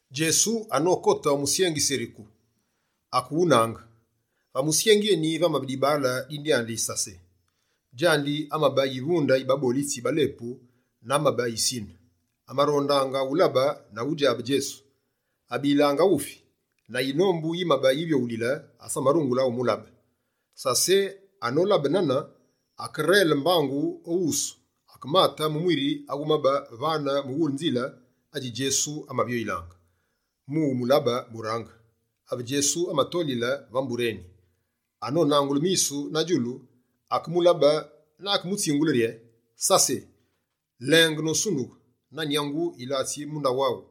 Djesu anokote o musyengi Seriku, akewunaange. Va musyengi eni, vamabe dibaale, dine dyandi Sase; djandi amabe yivunde yi babolitsi ba lepu na amabe yisine. Amarondaange ulabe na udjabe Djesu. Abilange aghufi, na yinombu yimabe yivyoghulile, asamarungule umulabe. Sase, anolabe nane, akerele mbangu o wusu, akemate mu mwiri awumabe vane mughule nzile adji Djesu amavyoyilaange mu umulabe burange. Ave Djesu amatolile va mbure eni, anonangule misu na djulu, akemulabe na akemutsingule rye: «Sase, lenge nosundughe! Na nyangu, yilatsi mu ndaghu aghu.»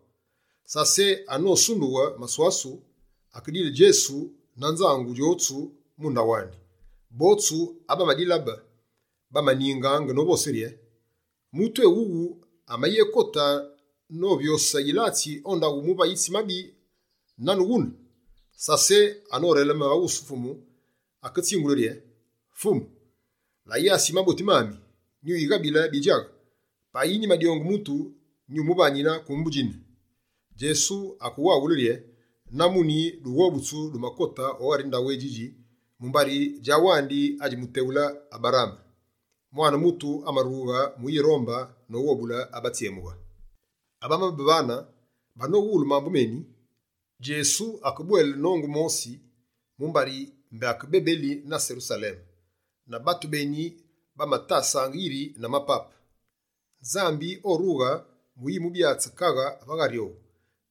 Sase anosundughe maswasu, akedile Djesu na nzangu djotsu mu ndaghu andi. Botsu abamadilabe, bamaningaange novose rye: «Mutu éwuwu amayekote novyose yilatsi o ndaghu muvayitsi mabi nane wune!» Sase anoreleme va wusu Fumu, aketsingule rye: «Fumu, la yasi yi maboti mami, nyuyighabile bidjaghe. Payi nyimadyonge mutu, nyumuvanine kumbu djine.» Djesu akewaghule rye: «Na muni, dughobutsu dumakote o ghari ndaghu édjidji, mumbari djawandi adji muteghule Aberaame. Mwane Mutu amarughe mu uyirombe noghobule abatsyemughe.» Abamabe vane, banowulu mambu meni, Djesu akebwele nongu mosi mumbari mbé ake bebeli na Serusaleme. Na batu beni bamatasaange yiri na mapape, Nzambi orughe mu uyibyatsu kaghe va ghari owu.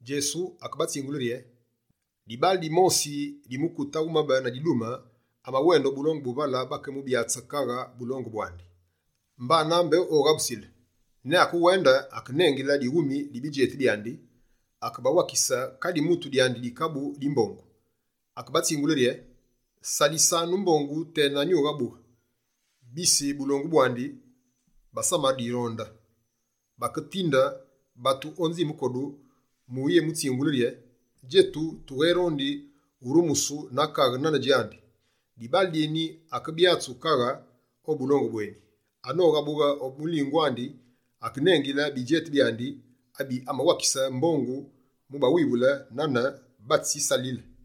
Djesu akebatsingule rye: «Dibaale dimosi di mukute awumabe na didume, amawende o bulongu bu vale bakeyémubyatse kaghe bulongu bwandi, mbana mbé oghabusile. Ne akewende, akenengile dighumi di bidjeti byandi, akewakise kadi mutu dyandi dikabu di mbongu. Akebatsingule rye: “Salisanu mbongu tena nyughabughe.” Bise bulongu bwandi, basamadironde, baketinde batu o nzime kodu mu uyemutsingule rye: “Djetu, tugherondi urumusu na kaghe nane djandi.” Dibaale dyeni akebyatsu kaghe o bulongu bweni. Anoghabughe o mulingu andi, akenengile bidjeti byandi abe amawakise mbongu mu bawivule nane bamatsisalisile.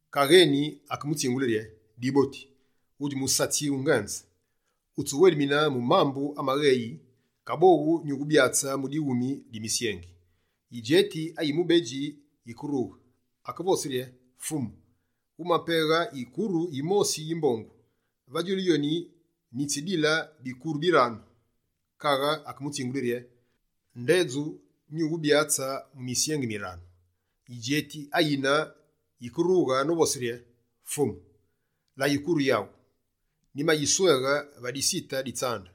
Kaghe eni, akemutsingule rye: “Diboti, wudji musatsi wungenze, wutsiwelemine mu mambu amagheyi, kaboghu nyuwubyatse mu dighumi di misyengi.” Yidjeti ayi mubedji yike rughe, akevose rye: “Fumu, wumapeghe yikuru yimosi yi mbongu, va djulu yoni, nyitsidile bikuru biranu.” Kaghe akemutsingule rye: “Ndedju, nyuwubyatse mu misyengi miranu.” Yidjeti ayine yike rughe novose rye: “Fumu, la yikuru yaghu, nyimayisweghe va disite di tsande.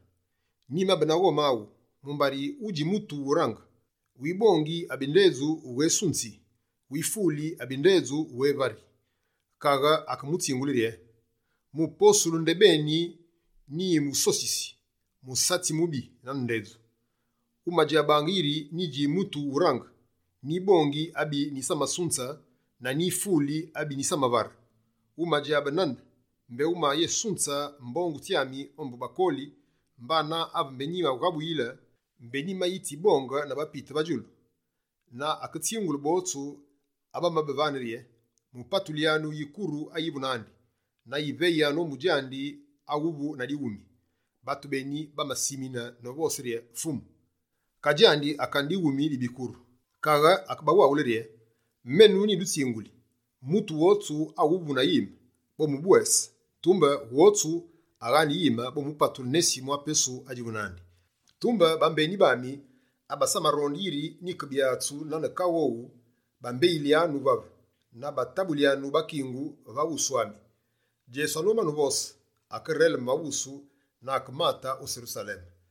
Nyimabe na ghome aghu, mumbari wudji mutu wurange: wibongi abi ndedju wughésunzi; wifuli abi ndedju wughévari.” Kaghe akemutsingule rye: “Mu posulu ndebeni nyiwusosisi, musatsi mubi nane ndedju! Wumadjabaange yiri nyidji mutu wurange: nyibongi abi nyisamasunze na nyifuli abi nyisamavare. Wumadjabe nane, mbé wumayesunze mbongu tsyami ombu bakoli, mbana ave mbé nyimaghabuyile, mbé nyimayitsibonge na bapite va djulu?” Na aketsingule botsu abamabe vane rye: “Mupatulyanu yikuru ayivu nandi, na yiveyanu ombu djandi awavu na dighumi.” Batu beni, bamasimine novose rye: “Fumu, ka djandi akane dighumi di bikuru!” Kaghe akebawaghule rye: “Menu nyidutsinguli: mutu wotsu awuvu na yime, bomubwese; tumbe wotsu aghaane yime, bomupatule nesi mwa pesu adjivu nandi. Tumbe bambeni bami abasamaronde yiri nyike byatsu nane kaghe owu, bambeyilyanu vave na batabulyanu bakingu va wusu ami.”» Djesu anomane uvose, akerele va wusu na akemate o Serusaleme.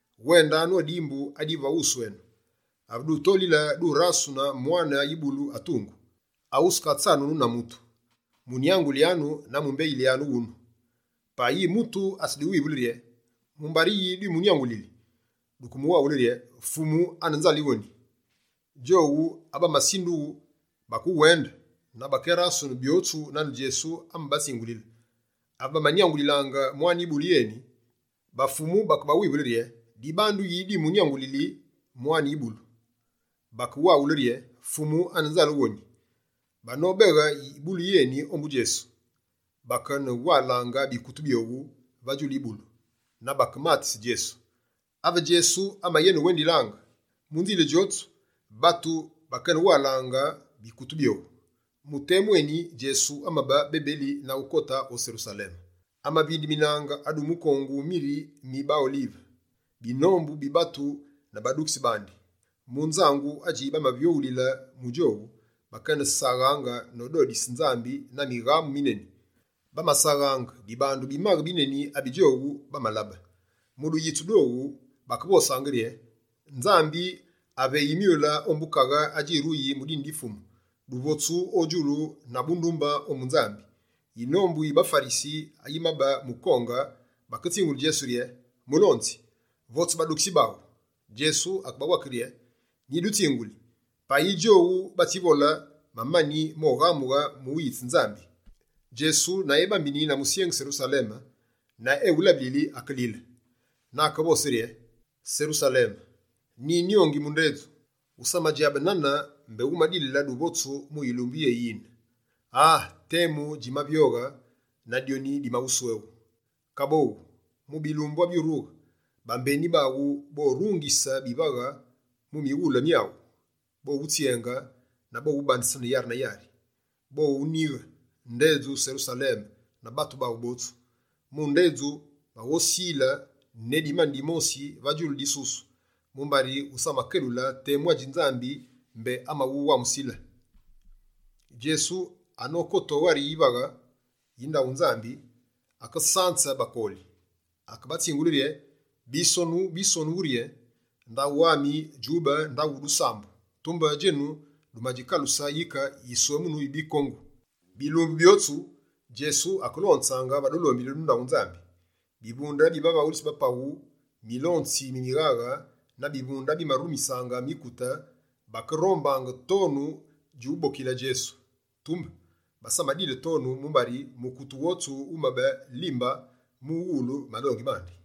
«Wendanu o dimbu adivu va wusu enu. Ave dutolile, durasune mwane yibulu atungu, awuskatsanunu na mutu. Munyangulyanu na mumbeyilyanu wunu. Payi mutu atsiduwivule rye: “Mumbari yi dwimunyangulili?” Duke muwaghule rye: “Fumu ane nzale woni.”» Djowu abasindughu bakewende, na bakerasunu byotsu nane Djesu amabatsingulile. Ave bamanyangulilaange mwane yibulu yeni, ba fumu, bakebawivule rye: «Dibandu yi dwinyangulili mwane yibulu?» Bakebawaghule rye: «Fumu ane nzale woni.» Banobeghe yibulu yeni ombu Djesu, bakene walange bikutu byowu va djulu yibulu, na bakematise Djesu. Ave Djesu amayene wendilaange, mu nzile djotsu, batu bakeyene walange bikutu byowu. Mu temu eni Djesu amabe bebeli na ukote o Serusaleme. Amavindeminange adu mukongu miri mi baOlive, binombu bi batu na badukitsi bandi, mu nzangu adjimavyoghulile mu djowu, bakesaghange nododise Nzambi na mighamu mineni. Bamasaghaange, dibandu bimaghe bineni abi djowu bamalabe. Mu duyitsu dwowu, bakevosange rye: «Nzambi aveyi myule ombu kaghe adjiruyi mu dine di Fumu! Duvotsu o djulu na bundumbe ombu Nzambi!» Yinombu yi baFarisi yimabe mukonge, baketsingule Djesu rye: «Mulonzi, votse badukitsi baghu!» Djesu akebawake rye: «Nyidutsinguli, payi djowu batsivole, mamani moghamughe mu uyitse Nzambi.» Djesu na ebambini na musyengi Serusaleme, na ewulabilili, akelile. Na akevose rye: «Serusaleme, nyinyongi mu ndedju, wusamadjabe nane mbé wumadilile duvotsu mu yilumbu yéyine, aa temu dji mavyoghe na dyoni dimawusweghu. Kaboghu, mu bilumbu abyurughe, bambeni baghu borungise bivaghe mu mighule myaghu, bowutsyenge na bowubandesene yari na yari. Bowunighe ndedju Serusaleme na batu baghu botsu. Mu ndedju, baghowusile ne dimani dimosi va djulu disusu, mumbari wusamakelule temu adji Nzambi mbé amawuwamusile.» Djesu anokote o ghari yivaghe yi ndaghu Nzambi, akesanze bakoli. Akebatsingule rye: «Bisonu bi Nzambi bivosi rye: Ndaghu ami djube ndaghu dusambu. Tumbe djenu dumadjikaluse yike yiswemunu yi bikongu.» Bilumbu byotsu, Djesu akelonzaange va dulombili du ndaghu Nzambi. Bivunde bi bavaghulitsi ba paghu, milonzi mi mighaghe na bivunde abimarumisaange mikute bakerombange tonu djubokile Djesu. Tumbe, basamadile tonu, mumbari mukute wotsu wumabe limbaa, mu uwulu malongi mandi.